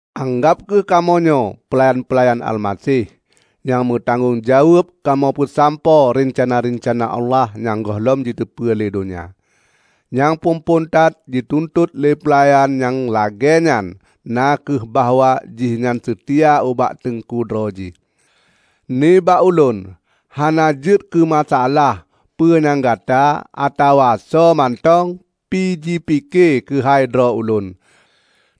Anggab kheueh kamoenyoe peulayan-peulayan Almaseh, nyang meutanggong jaweueb kamoe peusampoe reuncana-reuncana Allah nyang gohlom jiteupeu lé donya. Nyang phon-phon that jituntot lé peulayan nyang lagée nyan na kheueh bahwa jihnyan seutia ubak teungku droe jih. Nibak ulôn, hana jeuet keumasaalah peue nyang gata -- atawa soe mantong -- pi jipike keuhai droe ulôn.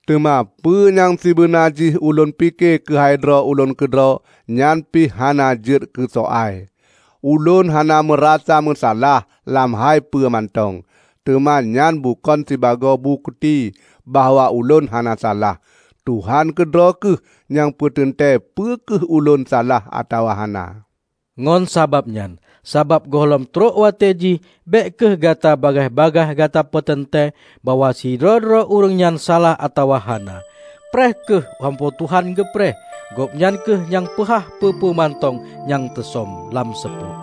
Teuma peue nyang sibeuna jih ulôn pike keuhai droe ulôn keudroe nyan pih hana jeuet keusoai. Ulôn hana meurasa meusalah lam hai peue mantong, teuma nyan bukon sibagoe bukeuti bahwa ulôn hana salah. Tuhan keudroe kheueh nyang peuteuntée peu kheueh ulôn salah atawa hana. Ngon sabab nyan, sabab gohlom trok watée jih, bék kheueh gata bagaih-bagaih gata peuteuntée bahwa sidroe-droe ureuëng nyan salah atawa hana. Preh kheueh sampoe Tuhan geupreh. Gobnyan kheueh nyang peuhah peue-peue mantong nyang teusöm lam seupôt.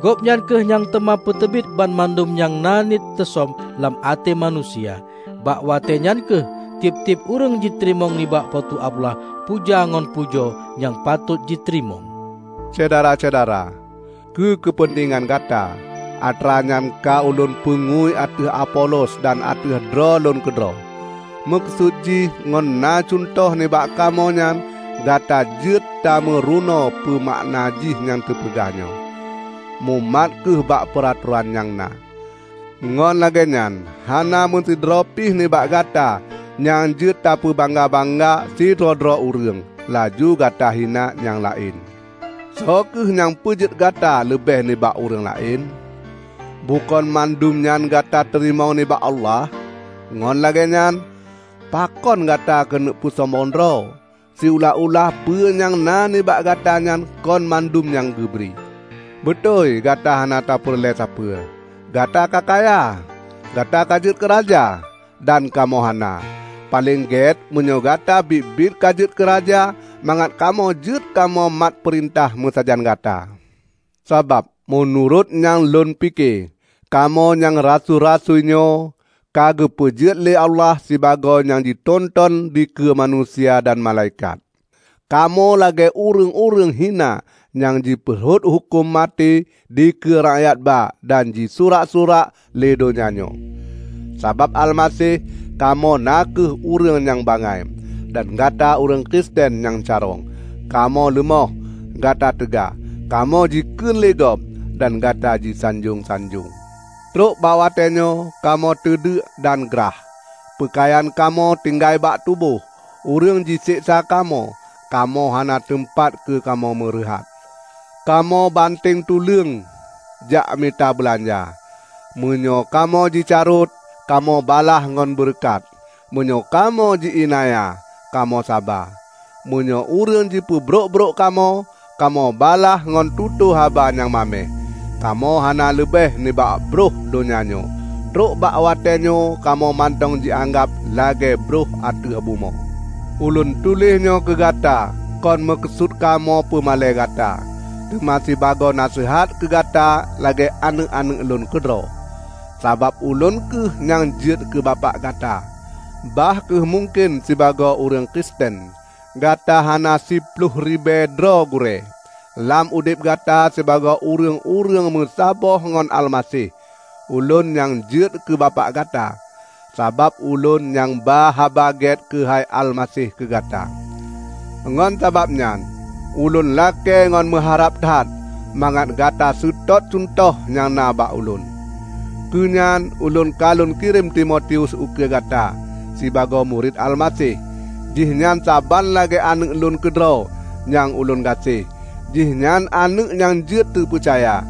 Gobnyan kheueh nyang teuma peuteubiet banmandum nyang na niet teusöm lam até manusia. Bak watéenyan kheueh tieb-tieb ureuëng jiteurimong nibak Po teu Allah puja ngon pujoe nyang patot jiteurimong. Syedara-syedara! Keu keupeuntengan gata, atranyan ka ulôn peungui ateueh Apolos dan ateueh droe lôn keudroe. Meukeusut jih ngon na cuntoh nibak kamoe nyan gata jeuet tameurunoe peumakna jih nyang teupeugah nyoe, "Mumat kheueh bak peuratoran nyang na." Ngon lagéenyan hana meusidroe pih nibak gata nyang jeuet tapeubangga-bangga sidroe-droe ureuëng, laju gata hina nyang laén. Soe kheueh nyang peujeuet Gata leubeh nibak ureuëng laén? Bukon mandumnyan Gata teurimong nibak Allah? Ngon lagée nyan, pakon Gata keuneuk peusombong droe, siulah-ulah peue nyang na nibak Gata nyan kon mandum nyang geubri? Beutôi gata hana tapeureulée sapeue! Gata ka kaya! Gata ka jeuet keuraja! Dan kamoe hana. Paleng gét meunyoe gata biet-biet ka jeuet keu raja, mangat kamoe jeuet kamoe matpeurintah meusajan gata. Sabab meunurot nyang lôn pike, kamoe nyang rasui-rasui nyoe, ka geupeujeuet lé Allah sibagoe nyang jinonton dikeue manusia dan malaikat. Kamoe lagée ureuëng-ureuëng hina nyang jipeurhot huköman maté dikeue rakyatba dan jisurak-surak lé donya nyoe. Sabab Almaseh, kamoe na kheueh ureuëng nyang bangai, dan gata ureuëng Kristen nyang carông! Kamoe leumoh, gata teuga! Kamoe jikheun lé gob, dan gata jisanjong-sanjong! Trok bak watée nyoe kamoe teundeuk dan grah; peukayan kamoe tinggai bak tuboh; ureuëng jiseksa kamoe; kamoe hana teumpat keu kamoe meureuhat; Kamoe banteng tuleueng jakmita beulanja. Meunyoe kamoe jicarot, kamoe balaih ngon beureukat; meunyoe kamoe ji iélanya, kamoe saba; meunyoe ureuëng jipeubrok-brok kamoe, kamoe balaih ngon tutoe haba nyang maméh. Kamoe hana leubeh nibak brôh donya nyoe; trok bak watéenyoe kamoe mantong jianggab lagée brôh ateueh bumoe. Ulôn tuléh nyoe keugata kon meukeusut kamoe pumalée gata, teuma sibagoe naseuhat keugata lagée aneuëk-aneuëk lôn keudroe. Sabab ulôn kheueh nyang jeuet keu bapak gata, bah kheueh mungken sibagoe ureuëng Kristen, gata kana siploh ribée droe gurée. Lam udeb gata sibagoe ureuëng-ureuëng meusaboh ngon Almaseh, ulôn nyang jeuet keu bapak gata, sabab ulôn nyang ba Haba Gét keuhai Almaseh keu gata. Ngon sabab nyan ulôn lakée ngon meuharab that mangat gata seutôt cuntoh nyang na bak ulôn. Keunyan ulôn ka lôn kirém Timotius ukeue gata. Sibagoe murit Almaseh, jihnyan saban lagée aneuëk lôn keudroe nyang ulôn gaséh. Jihnyan aneuëk nyang jeuet teupeucaya.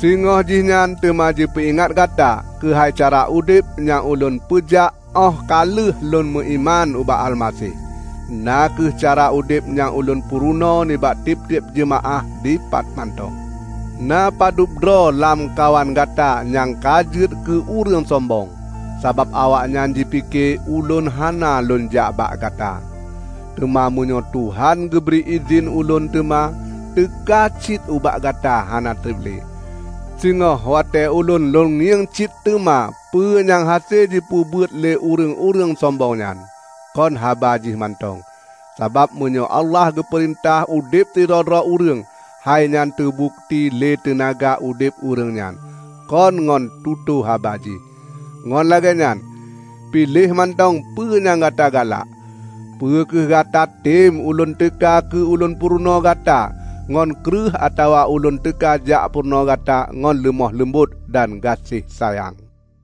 Singoh jihnyan teuma jipeuingat gata keuhai cara udeb nyang ulôn peujak óh ka lheueh lôn meuiman ubak Almaseh, na kheueh cara udeb nyang ulôn purunoe nibak tieb-tieb jeumaáh dipat mantong. Na padubdroe lamkawan gata nyang ka jeuet keu ureuëng sombong, sabab awaknyan jipike ulôn hana lônjak bak gata. Teuma meunyoe Tuhan geubri idhin ulôn teuma teuka cit ubak gata hana treb le. Singoh watée ulôn lôn ngieng cit teuma peue nyang hase jipeubuet lé ureuëng-ureuëng sombong nyan; kon haba jih mantong. Sabab meunyoe Allah geupeurintah udeb sidroe-droe ureuëng, hainyan teubukeuti lé teunaga udeb ureuëng nyan, kon ngon tutoe haba jih. Ngon lagée nyan, piléh mantong peue nyang gata galak! Peu kheueh gatatem ulôn teuka keu lôn purunoe gata ngon kreueh atawa ulôn teuka jak purunoe gata ngon leumoh leumbot dan gaséh sayang?